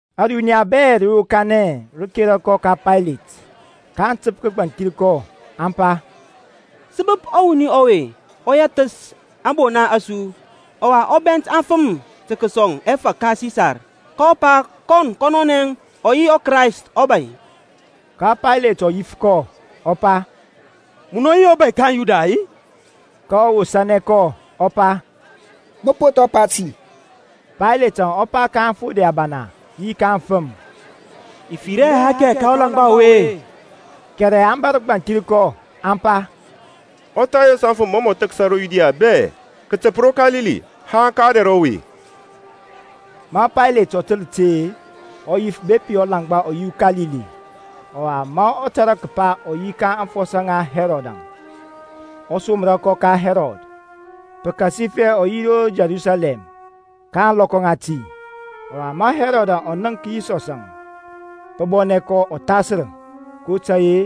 Ȧruniya bɛ rə yokanɛ, rə kera kɔ ka Paylet. kaŋ təp kəgbanthir kɔ, aŋ pa, Sə bəp ɔwuni ɔwe ɔ yɛthəs ȧŋbona a su, ɔwa ɔ bɛnt aŋfəm tə kəsɔŋ ɛfȧk ka Sisar, kɔ pa kɔn kɔnɔnɛ ɔ yi ɔKrayst ɔbȧy. Ka Paylet ɔ yif kɔ, ɔ pa, Munɔ yi ɔbȧy ka aŋYuda-i? kɔ wosȧnɛ kɔ ɔ pa, Mə po thɔ pa ti. Paylet ɔ pa ka aŋfode abana yi ka aŋfəm, I fir hɛ athɛkɛ ka ɔlaŋgba ɔwe. Kɛrɛ aŋ bȧsər gbanthir kɔ aŋ pa, Ɔ thayos aŋfəm mɔ mɔ thəksa ro Yudia bɛ, kətəp ro Kalili haŋ ka ɔdɛr ɔwe. Ma Paylet ɔ təl ȧte-e, ɔ yif bepi ɔlaŋgba ɔ yi uKalili. Ɔwa ma ɔ tȧrȧ kəpa ɔ yi ka aŋfɔsɔ ŋa Hɛrɔdȧŋ, ɔ somra kɔ ka Hɛrɔd, pəkasifɛ ɔ yi ro Yerusalɛm ka ȧŋlɔkɔ ŋati. Ɔwa ma Hɛrɔd ɔ nənk Yisɔsȧŋ, pə bɔnɛ kɔ ɔthasər, kotȧy-e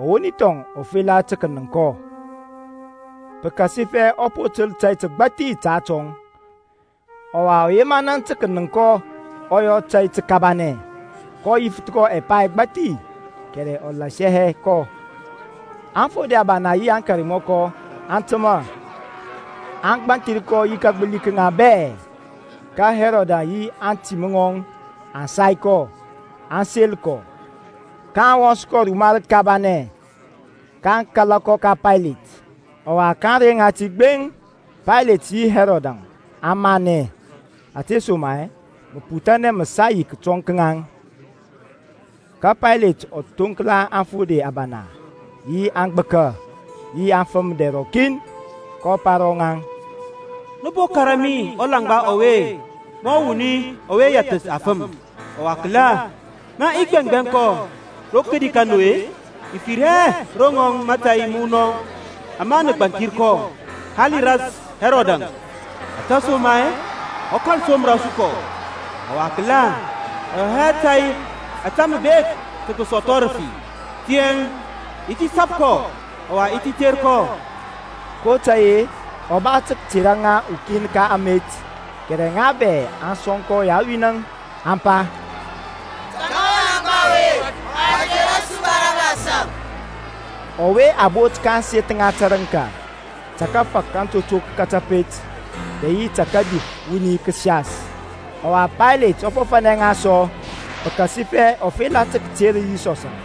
ɔwoni thɔŋ ɔ fela tə kənəŋk kɔ, pəkasifɛ ɔ po təl tȧy təgbȧthi ta atɔŋ. Ɔwa ɔ yema naŋ tə kənəŋk kɔ ɔ yɔ tȧy təkabanɛ. kɔ yifəth kɔ ɛpa ɛgbathi, kɛrɛ ɔ lasianɛ hɛ kɔ. Aŋfode abana yi aŋkarmɔkɔ aŋ təmȧ, aŋ gbanthir kɔ yi kagbəli ka ŋaŋ bɛ. Ka Hɛrɔd yi aŋtim ŋɔŋ aŋ sai kɔ, aŋ sel kɔ, ka aŋ wɔns kɔ ruma rəkabanɛ, kaŋ kala kɔ ka Paylet. Ɔwa ka ȧŋrey ŋati gbeŋ Paylet yi Hɛrɔdȧŋ aŋ manɛ, ȧtesoma-e məputhanɛ mə sa yi kətɔŋ ka ŋaŋ. Ka Paylet ɔ thoŋkla aŋfode abana, yi aŋgbəka, yi aŋfəm dɛr rɔkin, kɔ pa ro ŋaŋ, Nə po kȧrȧ mi ɔlaŋgba ɔwe mɔ wuni ɔwe yɛthəs aŋfəm; ɔwa kəla, ma i gbɛŋgbɛŋ kɔ rodi ka nu-e, i fir hɛ ro rɔŋɔŋ mȧtȧy məwunɔŋ ama nə gbanthir kɔ. Hali ras Hɛrɔdȧŋ, ȧtesoma-e ɔ kȧl somra su kɔ. Ɔwa kəla, ɔ yɔ hɛ tȧy ȧtȧ mə bek tə kəsɔthɔ rəfi. Tiyȧŋ i ti sap kɔ, ɔwa i ti ter kɔ. (kotȧy-e ɔ ba tə kətera ŋa ukin ka amet.) Kɛrɛ ŋa bɛ aŋ sɔŋkɔ yawin-əŋ, aŋ pa, Tɔŋa ɔlaŋgba ɔwe, ɔwa tera su Barabasȧŋ, (ɔwe a bot ka ȧŋseth ŋa tərəŋka ta kafak atotok ka kȧpet, dɛ yi ta kadif wuni kəsias). Ɔwa Paylet ɔ fɔfȧnɛ ŋa sɔ pəkasifɛ ɔ fela tə kəter Yisɔsȧŋ.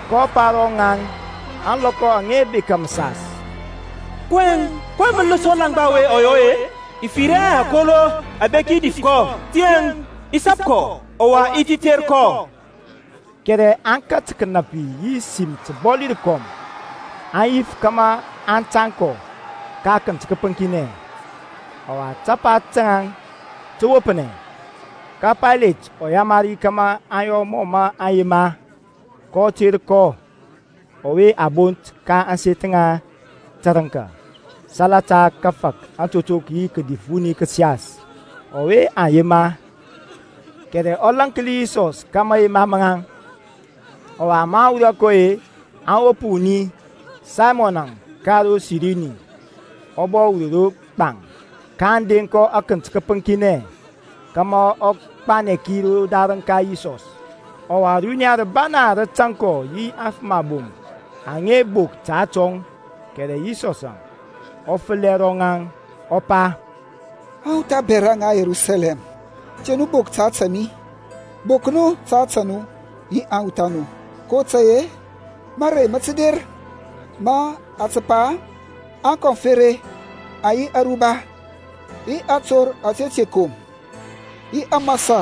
kɔ pa ro rɔŋaŋ ȧŋlɔkɔ aŋa bekȧ məsas, kɔyɛŋ, ko mələs ɔlaŋgba ɔwe mɔ yɔ-e? I fir hɛ akolo abeki dif kɔ; tiyȧŋ i ti sap kɔ, ɔwa i ti ter kɔ. Kɛrɛ aŋ kat kənapi yi sim təbɔli rəkɔm aŋ yif kȧmȧ a tȧŋ kɔ ka akənt kəpəŋkinɛ. Ɔwa tapa taŋ tə wopnɛ. Ka Paylet ɔ yamari kȧmȧ aŋ yɔ mɔ mə aŋ yema. kɔ ter kɔnɔ ɔwe a bot ka ȧŋseth ŋa tərəŋka salata kafak atotok yi kadif wuni kəsias, ɔwe aŋ yema; kɛrɛ ɔ lȧnki Yisɔs ka mayema maŋ. Ɔwa maŋ wurɔ kɔ-e, aŋ wop wuni, Saymɔnȧŋ ka ro Sirini, ɔ bɔ wur ro gbaŋ, kaŋ deŋ kɔ akənt kəpəŋkinɛ kȧmȧ ɔ gbanɛ ki rodarəŋ ka Yisɔs. Ɔwa, runiya rəbana rə tȧŋ kɔ yi aŋfəm abom aŋa bok ta atɔŋ. Kɛrɛ Yisɔsȧŋ ɔ fəlɛ ro ŋaŋ, ɔ pa, Awuth abɛra ŋa Yerusalɛm, te nu bok ta ȧtȧ mi, bok nu ta ȧtȧ nu yi aŋwuth a nu. kotȧy-e mȧrey mə tə der ma a tə pa-e, Aŋkoŋfereŋ aŋ yi aruba, yi ator ȧtȧ te kom, yi ȧmȧsȧ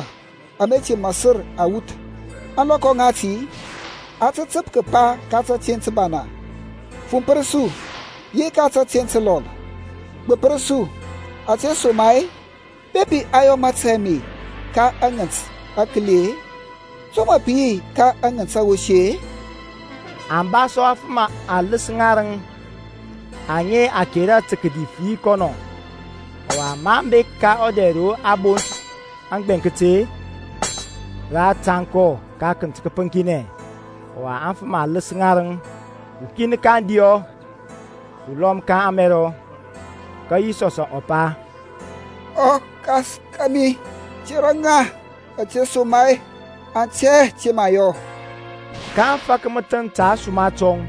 ȧme te mȧsər awuth. Ȧŋlɔkɔ ŋati aŋ tə təp kəpa ka tȧteŋ təbana, Fumpər su; yi ka tȧteŋ təlɔl, Gbəpsər su. Ȧtesoma-e bepi aŋ yɔ mȧtȧy ame ka aŋənt akəli-e, to mə pə yi ka aŋənt awosi-e? Aŋ ba sɔ afəm aləs ŋarəŋ aŋa a kera tə kədif yi kɔnɔ. Ɔwa maŋ bek ka ɔdɛr ro a bont aŋgbɛŋkət-e, rə a tȧŋ kɔ ka akənt kəpəŋkinɛ, ɔwa aŋfəm aləs ŋarəŋ, ukin ka kȧdiyɔ, ɔlɔm ka kȧmɛrɔ. Ka Yisɔsȧŋ ɔ pa, ƆKas kȧmi, tera ŋa ȧtesoma-e aŋ tɛ hɛ ȧte mə aŋ yɔ. Kaŋ fak məthəŋ ta ȧsuma tɔŋ.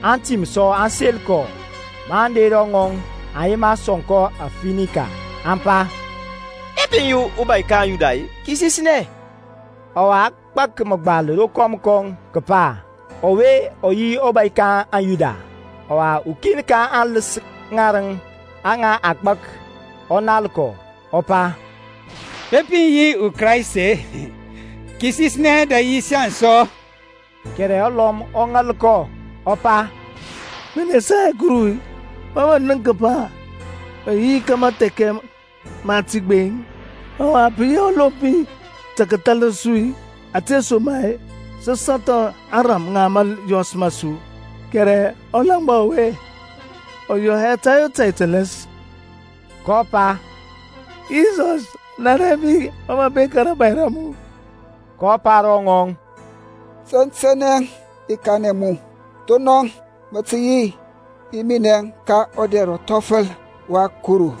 Antim sɔ aŋ sel kɔ; maŋ der ro ŋɔŋ aŋ yema sɔŋ kɔ afinika, aŋ pa, Bepi mə yi ɔbȧy kaŋ Yuda-e, kisisnɛ. Ɔwa a gbak məgbal rokɔm kɔŋ kəpa, ƆWE Ɔ YI ƆBȦY KA AŊYUDA. Ɔwa ukin ka aŋləs ŋarəŋ aŋa a gbak ɔ nal kɔ, ɔ pa, Bepi mə yi ɔKraist-e, kisisnɛ dɛ yi saŋ sɔ. Kɛrɛ ɔlɔm ɔ ŋal kɔ, ɔ pa, Mə nesa hɛ Kuru-i, ma mə nənk kəpa mə yi ka mathɛkɛ mati gbeŋ-i? Ɔwa pə yi ɔlompi tə kəthalər su ȧtesoma-e saŋ sə sɔthɔ ȧŋrȧm ŋa mȧyɔs ma su, kɛrɛ ɔlaŋgba ɔwe ɔ yɔ hɛ tȧy o tȧy tələs. kɔ pa, Yisɔs, Nanɛ mi ma mə bek ka rȧbȧy ra mu. kɔ pa ro ŋɔŋ, Tɛntɛnɛ i kanɛ mu, thonɔŋ mə tə yi yi minɛŋ ka ɔdɛr ɔthɔfəl wa Kuru.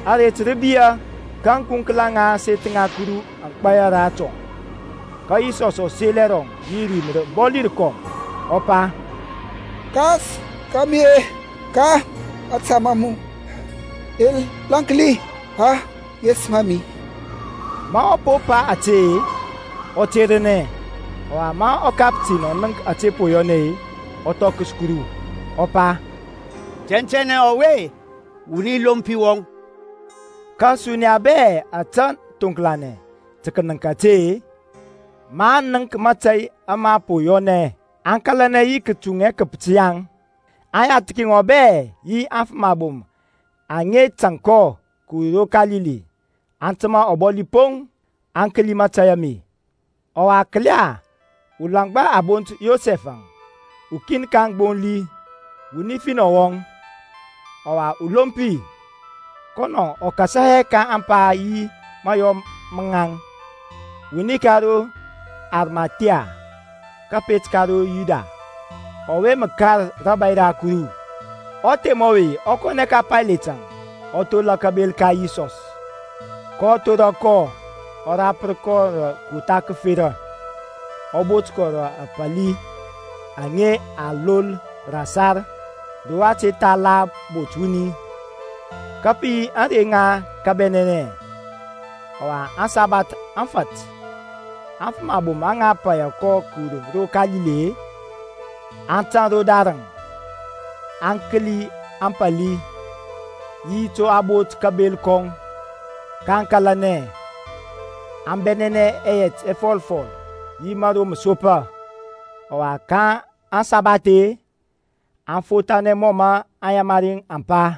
Aret rə biyȧ, ka ȧŋkunkla ŋa ȧŋseth ŋa Kuru aŋ gbaya ratɔŋ. Ka Yisɔsȧŋ ɔ sel ɛrɔŋ yi rim rəbɔli rəkɔm, ɔ pa, Kas ka mi-e, ka mȧta ma mu i lȧnki aŋesəm a mi. Ma ɔ po pa ȧte-e, ɔ ternɛ. Ɔwa ma ɔkaptin ɔ nənk ȧte po yɔnɛ-e, ɔ thɔkəs Kuru, ɔ pa, Tɛntɛnɛ ɔwe-e, wuni lompi wɔŋ. Ka ȧsuniya bɛ ȧtȧ thoŋklanɛ tə kənəŋk ȧte-e ma aŋ nənk mȧtȧy ama po yɔnɛ-ɛ, aŋ kȧlanɛ yi kətuŋ ɛkəpət yaŋ. Aŋyathki ŋɔŋ bɛ yi aŋfəm abom aŋa tȧŋ kɔ kəwur ro Kalili, aŋ təmȧ ɔbɔli poŋ, aŋ kəli mȧtȧy ame. Ɔwa kəla, ulaŋgba a bont Yosɛf-əŋ, ukin ka aŋgbonli, wuni finɔ wɔŋ, ɔwa ulompi, (kɔnɔŋ ɔ kasa hɛ ka ȧŋpa yi mayɔ maŋȧŋ), wuni ka ro Arimathia, kəpet ka ro Yuda, ɔwe mə kar rȧbȧy ra Kuru. Ɔthem ɔwe ɔ kɔnɛ ka Payletȧŋ, ɔ thola kabel ka Yisɔs. kɔ thora kɔ, ɔ rapər kɔ rə kotha kəfera, ɔ bot kɔ rə apali aŋa a lol rə ȧsar ro a te tha la bot wuni. Ka pə yi ȧŋrey ŋa kabɛnɛnɛ, ɔwa aŋsabath aŋ fat. Aŋfəm abom aŋa paya kɔ kəwur ro Kalili-e, aŋ tȧŋ rodarəŋ, aŋ kəli ȧŋpali, yi to a bot kabel kɔŋ. kaŋ kȧlanɛ, aŋ bɛnɛnɛ ɛyɛt ɛfɔlfɔl yi mȧro məsopa. Ɔwa ka aŋsabath-e aŋ fothanɛ mɔ mə aŋyamari aŋ pa.